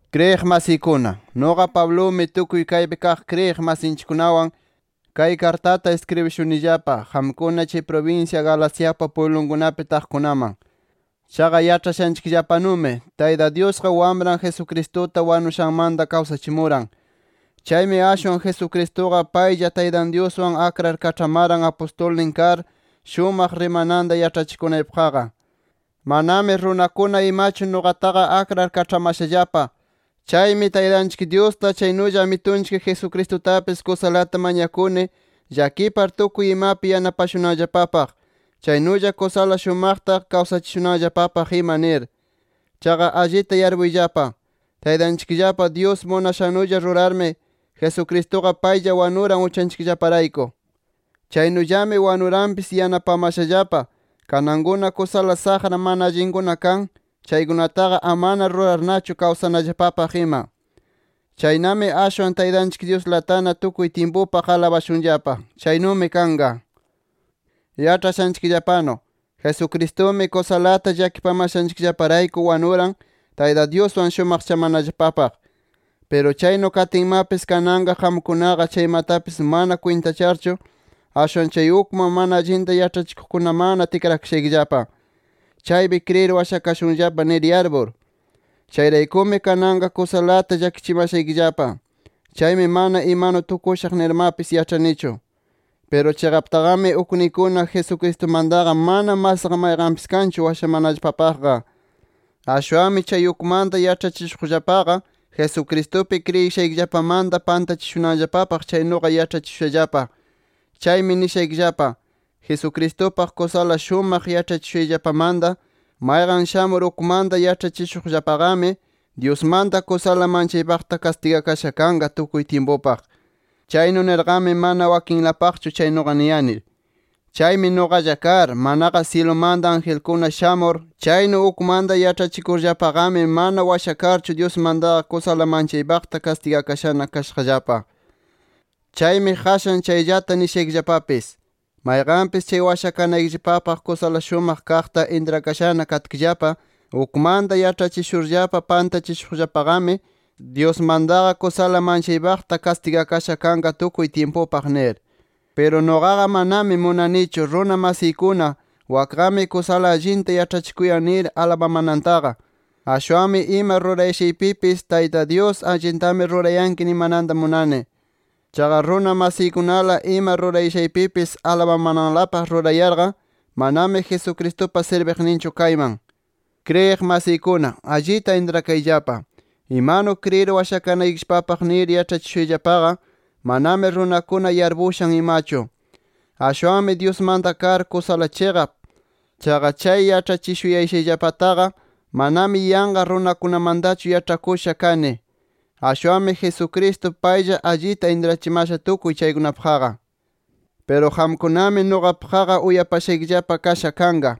Kriyiq masiykuna, nuqa Pablumi tukuy kaypi kaq kriyiq masinchikkunawan kay kartata iskribishunillapa qamkuna chay prubinsya Galaciapa pwiblunkunapi taqkunaman. Chaqa yaĉhashanchikllapanumi, Tayta Dyusqa Wamran Jesucristuta wanushanmanta kawsachimuran. Chaymi ashwan Jesucristuqa paylla Taytan Dyuswan akrar kaĉhamaran apustulnin kar, shumaq rimayninta yaĉhachikunaypaqqa. Manami runakuna imachu nuqataqa akrar kaĉhamashallapa. Chaymi Taytanchik Dyusta, chaynulla Amitunchik Jesucristutapis kusalata mañakuni llakipar tukuy imapi yanapashunanllapapaq, chaynulla kusala shumaqta kawsachishunanllapapaq ima nir. Chaqa allita yarpuyllapa: Taytanchikllapa Dyus munashannulla rurarmi, Jesucristuqa paylla wanuran uchanchikllaparayku. Chaynullami wanuranpis yanapamashallapa kanankuna kusala saqra mana allinkuna kan, chaykunataqa amana rurarnachu kawsanallapapaq ima. ¡Chaynami ashwan, Taytanchik Dyuslatana tukuy tyimpupaq alabashunllapa! ¡Chaynumi kanqa! Yaĉhashanchikllapanu, Jesucristumi kusalata llakipamashanchikllaparayku wanuran, Tayta Dyuswan shumaqchamanallapapaq. Piru chaynu katinmapis, kananqa qamkunaqa chaymatapis mana kwintacharchu, ashwan chay ukman mana allinta yaĉhachikuqkunamanna tikrakashaykillapa, chaypi kriyir washakashunllapa nir yarpur. Chayraykumi kananqa kusalata llakichimashaykillapa. Chaymi mana imanu tukushaq nirmapis yaĉhanichu. Piru chiqaptaqami ukniykuna, Jesucristumantaqa mana masqa mayqanpis kanchu washamanallapapaqqa. Ashwanmi chay ukmanta yaĉhachishuqllapaqa Jesucristupi kriyishaykillapamanta pantachishunanllapapaq chaynuqa yaĉhachishushallapa. Chaymi nishaykillapa: Jesucristupaq kusala shumaq yaĉhachishushayllapamanta, mayqan shamur ukmanta yaĉhachishuqllapaqami, Dyusmanta kusala manchaypaqta kastigakasha kanqa tukuy tyimpupaq. Chaynu nirqami mana wakinlapaqchu chaynuqa niyani. Chaymi nuqalla kar, manaqa syilumanta angelkuna shamur chaynu ukmanta yaĉhachikurllapaqami, mana washakarchu Dyusmantaqa kusala manchaypaqta kastigakashana kashaqllapa. Chaymi qashan chayllata nishaykillapapis: Mayqanpis chay washakanaykillapapaq kusala shumaq kaqta intrakashana katkillapa ukmanta yaĉhachishurllapa pantachishuqllapaqami, Dyusmantaqa kusala manchaypaqta kastigakasha kanqa tukuy tyimpupaq nir. Piru nuqaqa manami munanichu runa masiykuna wakqami kusala allinta yaĉhachikuyan nir alabamanantaqa. Ashwanmi ima rurayashaypipis, Tayta Dyus allintami rurayanki nimananta munani. Chaqa runa masiykunala ima rurayashaypipis alabamananlapaq rurayarqa, manami Jesucristupa sirbiqninchu kayman. Kriyiq masiykuna, allita intrakayllapa: Imanu kriyir washakanaykillapapaq nir yaĉhachishushayllapaqa, manami runakuna yarpushan imachu. Ashwanmi Dyusmanta kar kusala chiqap. Chaqa chay yaĉhachishuyashayllapataqa manami yanqa runakunamantachu yaĉhakusha kani. Ashwanmi Jesucristo paylla allita intrachimasha tukuy chaykunapaqqa. Piru qamkunami nuqapaqqa uyapashaykillapa kasha kanqa,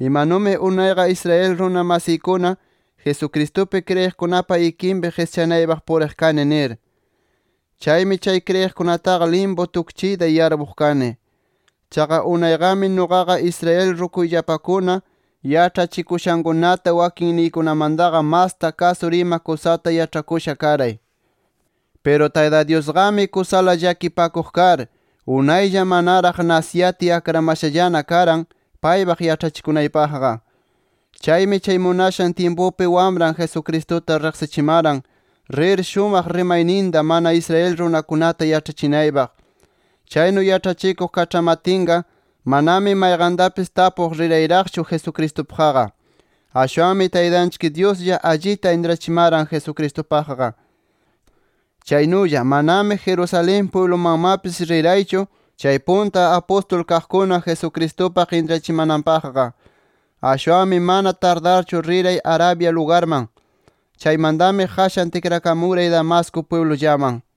imanumi unayqa Israel runa masiykuna Jesucristupi kriyiqkunapa ikinpi qischanaypaq puriq kani nir. Chaymi chay kriyiqkunataqa limpu tukchiyta yarpuq kani. Chaqa unayqami nuqaqa, Israel rukuyllapakuna yaĉhachikushankunata wakinniykunamantaqa masta kasur ima kusata yaĉhakusha karay. Piru Tayta Dyusqami kusala llakipakuq kar, unaylla manaraq nasiyatiy akramashallana karan, paypaq yaĉhachikunaypaqqa. Chaymi chay munashan tyimpupi Wamran Jesucristuta riqsichimaran, rir shumaq rimayninta mana Israel runakunata yaĉhachinaypaq. Chaynu yaĉhachikuq kaĉhamatinqa manami mayqantapis tapuq rirayraqchu Jesucristupaqqa. Ashwanmi Taytanchik Dyuslla allita intrachimaran Jesucristupaqqa. Chaynulla manami Jerusalén pwiblumanmapis riraychu, chay punta apustul kaqkuna Jesucristupaq intrachimananpaqqa. Ashwanmi mana tardarchu riray Arabia lugarman. Chaymantami qashan tikrakamuray Damasco pwiblullaman.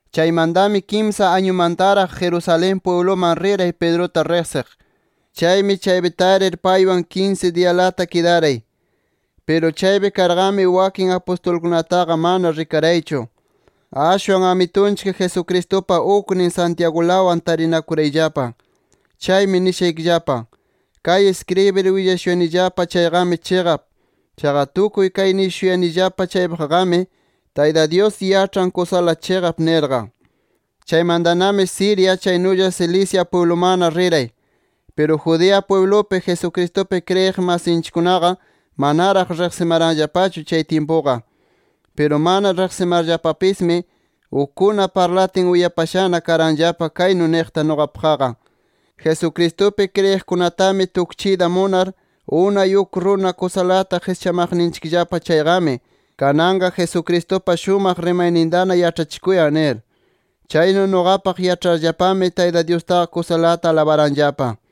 Chaymantami kimsa añumantaraq Jerusalén pwibluman riray Pedruta riqsiq. Chaymi chaypi tarir, paywan kinsi diyalata kidaray. Piru chaypi karqami, wakin apustulkunataqa mana rikaraychu. Ashwan Amitunchik Jesucristupa uknin Santiagulawan tarinakurayllapa. Chaymi nishaykillapa: Kay iskribir willashuyanillapa chayqami chiqap. Chaqa tukuy kay nishuyanillapa chaypaqqami, Tayta Dyus yaĉhan kusala chiqap nirqa. Chaymantanami Siria, chaynulla Cilicia pwiblumanna riray. Piru Judea pwiblupi, Jesucristupi kriyiq masinchikkunaqa manaraq riqsimaranllapachu chay tyimpuqa. Piru mana riqsimarllapapismi, ukkuna parlatin uyapashana karanllapa kaynu niqta nuqapaqqa: “Jesucristupi kriyiqkunatami tukchiyta munar, unay uk runa kusalata qischamaqninchikllapa chayqami, kananqa Jesucristupa shumaq rimaynintana yaĉhachikuyan” nir. Chaynu nuqapaq yaĉharllapami, Tayta Dyustaqa kusalata alabaranllapa.